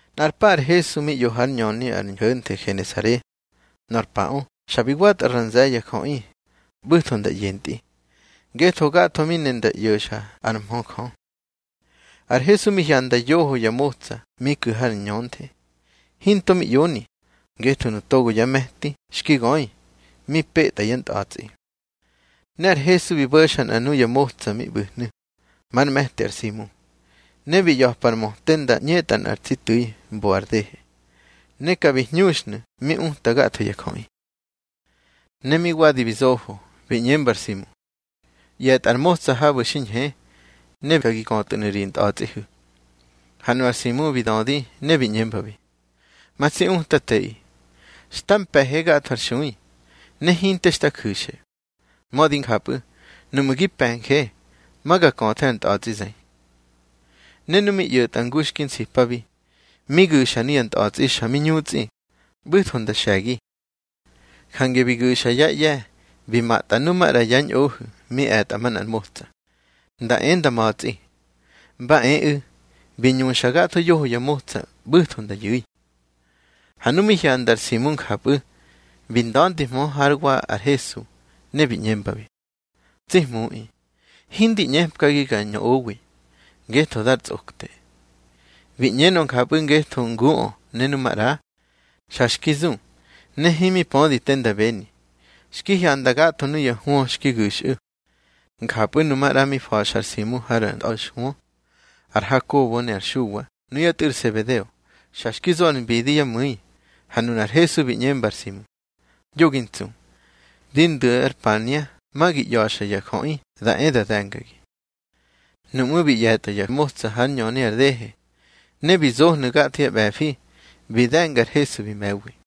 Nꞌar pa ar Hesu mi ꞌyo hár ñöni ar ñho̱nthe Genesare. Nor paꞌö xa bi watꞌa ra nze̱ ya jöꞌi, ꞌbu̱tho nda ꞌyentꞌi, ngetho gatho mi ne nda ꞌyo̱xa ár mhö Jö. Ar Hesu mi hyanda yoho ya motsa mi ku̱ har ñönthe. Hinto mi ꞌyoni, ngetho nu togo yá me̱ti xki göi, mi petꞌa yá ntꞌa̱tsꞌi. Ne ar Hesu bi bo̱xa nꞌa nuya motsa mi ꞌbu̱hnu̱, már me̱ti ar Simu. Ne bi ꞌya̱pa ar möte nda ꞌñetꞌa nꞌar tsi tu̱i mbo ar dehe, ne ka bi hñuxnu̱ mi uta gatho ya jöꞌi. Ne mi wadi bi zofo, bi ꞌñemba ar Simu: —ꞌYe̱tꞌa ar motsa habu̱ xi ñhe, ne ka gi köthu̱nu̱ ri ntꞌa̱tsꞌihu̱. Ha nu ar Simu bi dödi ne bi ꞌñembabi: —Ma tsi Utateꞌi, xta mpe̱he gatho ar xui, ne hinte xta ju̱xe. Mödi njapꞌu̱, nuꞌmu̱ gi pe̱nje, ma ga köthe ar ntꞌa̱tsꞌi zëi. Ne nu mi ꞌyo̱tꞌa ngu xki nsipabi, mi gu̱xa nuya ntꞌa̱tsꞌi xa mi ñutsꞌi, ꞌbu̱tho nda xe̱gi. Jange bi gu̱xa yá ꞌye̱ bi matꞌa nu maꞌra yá ñꞌohu̱ mi e̱tꞌa manꞌar motsa, nda e nda ma̱tsꞌi. Mba eꞌu̱, bi ñuꞌsa gatho yoho ya motsa, ꞌbu̱tho nda yu̱i. Ha nu mi hyanda ar Simu njapꞌu̱, bi nda̱ndihmö hár wa ar Hesu, ne bi ꞌñembabi: —Tsi Hmuꞌi, hindi ꞌñepkagi ga ñꞌowi, ngetho dar tsꞌokte. Bi ꞌñenö njapꞌu̱ ngetho nguꞌö ne nu maꞌra, xa xki zu, ne himi pödi te nda beni, xki hyanda gatho nuya hwö xki gu̱xꞌu̱. Njapꞌu̱ nu maꞌra mi fa̱xa ar Simu har ntꞌa̱xhwö, ar Hakobo ne ar Xuwa nuyá tꞌu̱ ar Sebedeo, xa xki zo ar mbidi yá mu̱i. Ha nunar Hesu bi ꞌñemba ar Simu: —Yo gi ntsu. Di ndu̱ ar pania ma gi ꞌya̱xa ya jöꞌi da e da de̱ngagi. Nuꞌmú̱ bi ꞌye̱tꞌa ya motsa hár ñöni ar dehe, ne bi zohnu̱ gatho yá ꞌbe̱fi, bi de̱nga ar Hesu bi me̱wi.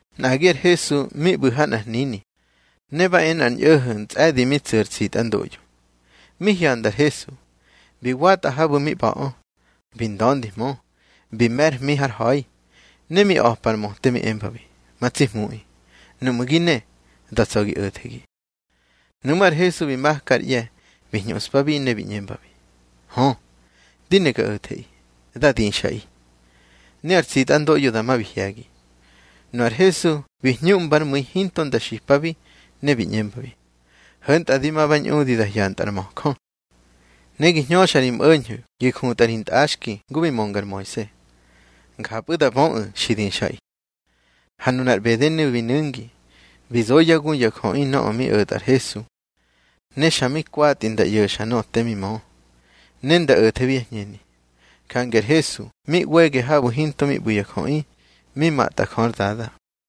Nꞌagi ar Hesu mi ꞌbu̱ ha nꞌar hnini, ne ba e nꞌar ñꞌo̱ho̱ ntsꞌe̱di mi tsu̱ ar tsitꞌandoꞌyo. Mi hyanda ar Hesu, bi watꞌa habu̱ mi ꞌba̱ꞌö, bi nda̱ndihmö, bi me̱ ár hmi har ha̱i. Ne mi a̱pa ar möte mi embabi: —Ma tsi Hmuꞌi, nuꞌmu̱ gi ne, da tsa̱ gi o̱thegi. Nuꞌmú̱ ar Hesu bi maka ár ꞌye̱, bi hñuꞌspabi ne bi ꞌñembi: —Hö, di ne ga o̱theꞌi. Dá dixꞌaꞌi. Ne ar tsitꞌandoꞌyo dama bi hye̱gi. Nu ar Hesu bi hñuꞌmba ár mu̱i hinto nda xipabi, ne bi ꞌñembabi: —Ho̱ntꞌa di ma ba ñꞌudi da hyantꞌa ar möjö. Ne gi hñöxa ri mꞌo̱ñho̱ gi jutꞌa ri ntꞌaxki ngu bi mönga ar Moise, njapꞌu̱ da böꞌu̱ xi dixꞌaꞌi. Ha nunar ꞌbedenu̱ bi nu̱ngi, bi zo yá gu ya jöꞌi nöꞌö mi o̱tꞌa ar Hesu. Ne xa mi kwatꞌi nda ꞌyo̱xa nöꞌö te mi mö, ne nda o̱thebi yá hñeni. Jange ar Hesu mi ꞌwege habu̱ hinte mi ꞌbu̱ ya jöꞌi, mi matꞌa Jö ár Dada.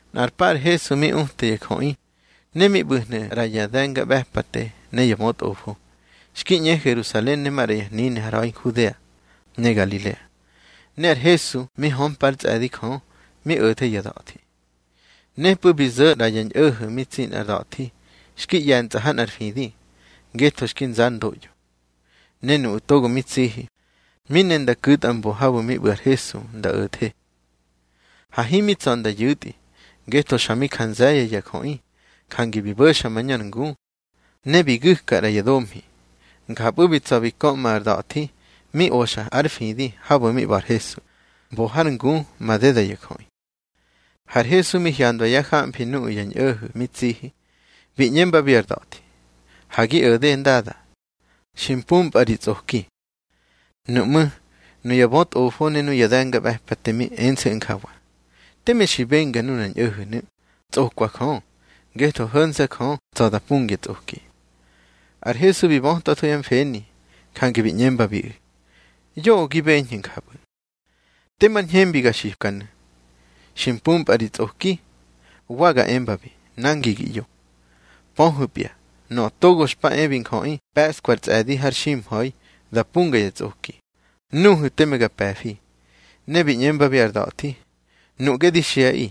Nꞌar pa ar Hesu mi uta ya jöꞌi, ne mi ꞌbu̱hnu̱ ꞌra ya de̱ngaꞌbe̱pate ne ya bötꞌofo, xki ꞌñe Herusalen ne maꞌra ya hnini har ha̱i Nhudea ne Ngalilea. Ne ar Hesu mi hömpa ár tsꞌe̱di Jö mi o̱the ya da̱thi. Nepꞌu̱ bi zo̱ ꞌra ya ñꞌo̱ho̱ mi tsi nꞌar da̱thi xki ꞌye̱ntsꞌa ha nꞌar fidi, ngetho xki nza ár ndoꞌyo. Ne nuꞌu̱ togo mi tsihi, mi ne nda ku̱tꞌa mbo habu̱ mi ꞌbu̱ ar Hesu nda o̱the. Ha himi tsa̱ nda yu̱tꞌi, ngetho xa mi ja nze̱ ya jöꞌi. Jange bi bo̱xa mañö ar ngu, ne bi gu̱ka ꞌra ya domhi. Njapꞌu̱ bi tsa̱ bi köꞌma ar da̱thi mi oxa ár fidi habu̱ mi ꞌba̱ ar Hesu, mbo har ngu madeda ya jöꞌi. Har Hesu mi hyandwa yá jamfi nuꞌu̱ ya ñꞌo̱ho̱ mi tsihi, bi ꞌñembabi ar da̱thi: —Ha gi o̱de, ndada. Xi mpumpꞌa ri tsꞌoki. Nuꞌmú̱ nuya bötꞌofo ne ya de̱ngaꞌbe̱pate mi ense̱ꞌu̱ njawa: Teme xi benga nunar ñꞌo̱ho̱nu̱, tsꞌokwa Jö. Ngetho ho̱nse̱ Jö tsa̱ da pungya tsꞌoki. Ar Hesu bi bötwatho yá mfeni, jange bi ꞌñembabiꞌu̱: —Yoꞌö gi beñhu̱ njapꞌu̱. Temar ñhembi ga xipkanu̱: Xi mpumpꞌa ri tsꞌoki. Wa ga embabi: Nangi gi ꞌyo. Pöhu̱pya, Nöꞌö Togo xpa e bi Njöꞌi pe̱ꞌskwa ar tsꞌe̱di har ximha̱i da punga ya tsꞌoki, nuhu̱ teme ma ga pe̱fi. Ne bi ꞌñembabi ar da̱thi: —Nuꞌge di xiꞌaꞌi: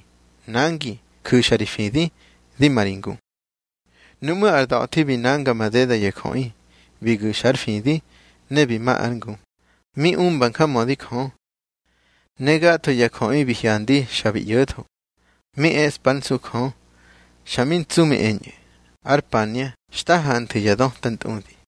Nangi, ju̱xa ri fidi, di ma ri ngu. Nuꞌmú̱ ar da̱thi bi nanga madeda ya jöꞌi, bi gu̱xa ár fidi, ne bi ma ár ngu, mi umba njamödi Jö. Ne gatho ya jöꞌi bi hyandi xa bi ꞌyo̱tho, mi eꞌspa ár nsu Jö, xa mi ntsu mi eñꞌu̱: —Ar pania xta hanthu̱ ya döta ntꞌudi.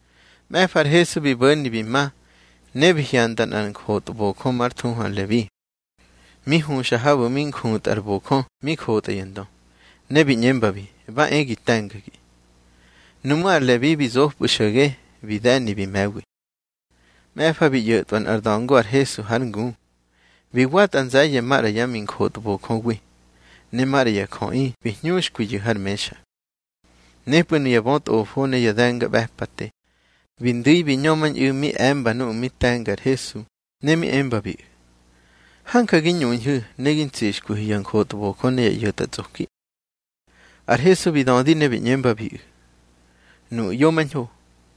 Mꞌe̱fa ar Hesu bi bo̱ni bi ma, ne bi hyanda nꞌar njotbojö már thuhu Lebi, mi huxa habu̱ mi njutꞌar bojö mi jotꞌa ya ndö. Ne bi ꞌñembabi: —Ba e gi te̱ngagi. Nuꞌmú̱ ar Lebi bi zopꞌu̱ xo̱ge, bi de̱ni bi me̱wi. Mꞌe̱fa bi ꞌyo̱tꞌwa nꞌar da̱ngo ar Hesu hár ngu. Bi watꞌa nze̱ye̱ maꞌra yá minjotbojöwi, ne maꞌra ya jöꞌi bi hñuxkwiyu̱ har mexa. Nepꞌu̱ nuya bötꞌofo ne ya de̱ngaꞌbe̱pate bi ndu̱i bi ñömañꞌu̱ mi e̱mba nuꞌu̱ mi te̱nga ar Hesu, ne mi embabiꞌu̱: —Hanja gi ñuñhu̱ ne gi ntsixkwihu̱ ya njotbojö ne ya ꞌyo̱tꞌatsꞌoki. Ar Hesu bi dödi ne bi ꞌñembabiꞌu̱: —Nuꞌu̱ ꞌyomañho,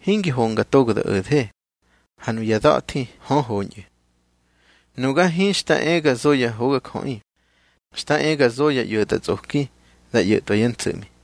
hingi honga togo da o̱the, ha nuya da̱thi hö, hoñꞌu̱. Nuga hinxta e ga zo ya hogajöꞌi. Xta e ga zo ya ꞌyo̱tꞌatsꞌoki da ꞌyo̱tꞌwa yá ntso̱ꞌmi.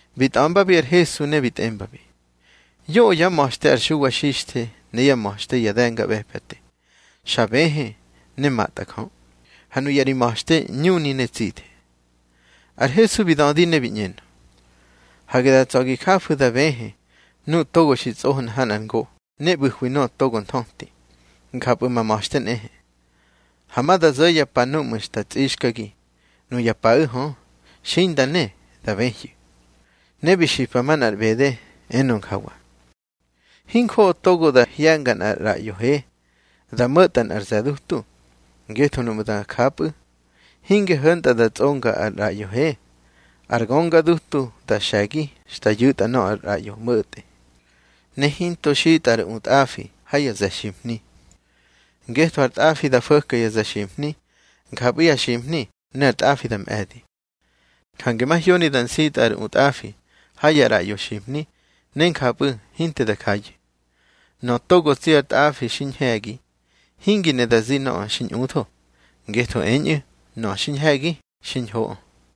Bi tꞌa̱mbabi ar Hesu, ne bi tꞌembabi: —Yoꞌö yá ma̱xte ar Xuwa Xixthe ne yá ma̱xte ya de̱ngaꞌbe̱pate xa bëhë ne matꞌa Jö. Ha nuya ri ma̱xte ñuni ne tsithe. Ar Hesu bi dödi ne bi ꞌñenö: —Hage da tsa̱ gi jafu̱ da bëhë nuꞌu̱ togo xi tsꞌohna ha nꞌar ngo ne ꞌbu̱hwi nöꞌö togo nthöti. Njapꞌu̱ ma ma̱xte nꞌehe. Ha ma da zo̱ ya pa núꞌmu̱ xta tsꞌixkagi. Nuya paꞌu̱ hö, xinda ne, da bëhyu̱. Ne bi xipa manꞌar ꞌbede, enö njawa: —Hinjoꞌo togo da hye̱nga nꞌar ꞌraꞌyo he da mo̱ꞌtꞌa nꞌar ze̱ dutu. Ngetho nuꞌmu̱ da japꞌu̱, hinge ho̱ntꞌa da tsꞌonga ar ꞌraꞌyo he, ar gönga dutu da xe̱gi xta yu̱tꞌa nöꞌö ar ꞌraꞌyo mꞌo̱tꞌe. Ne hinto xitꞌa ar utꞌafi ha ya ze̱ ximhni, ngetho ar tꞌafi da fo̱ka ya ze̱ ximhni, njapꞌu̱ ya ximhni ne ar tꞌafi da mꞌe̱di. Jange mahyoni da nsitꞌa ar utꞌafi ha ya ꞌraꞌyo ximhni, ne njapꞌu̱ hinte da jayu̱. Nöꞌö togo tsi ar tꞌafi xi ñhe̱gi, hingi ne da zi nöꞌö xi ñꞌutho, ngetho eñꞌu̱, nöꞌö xi ñhe̱gi xiñhoꞌö.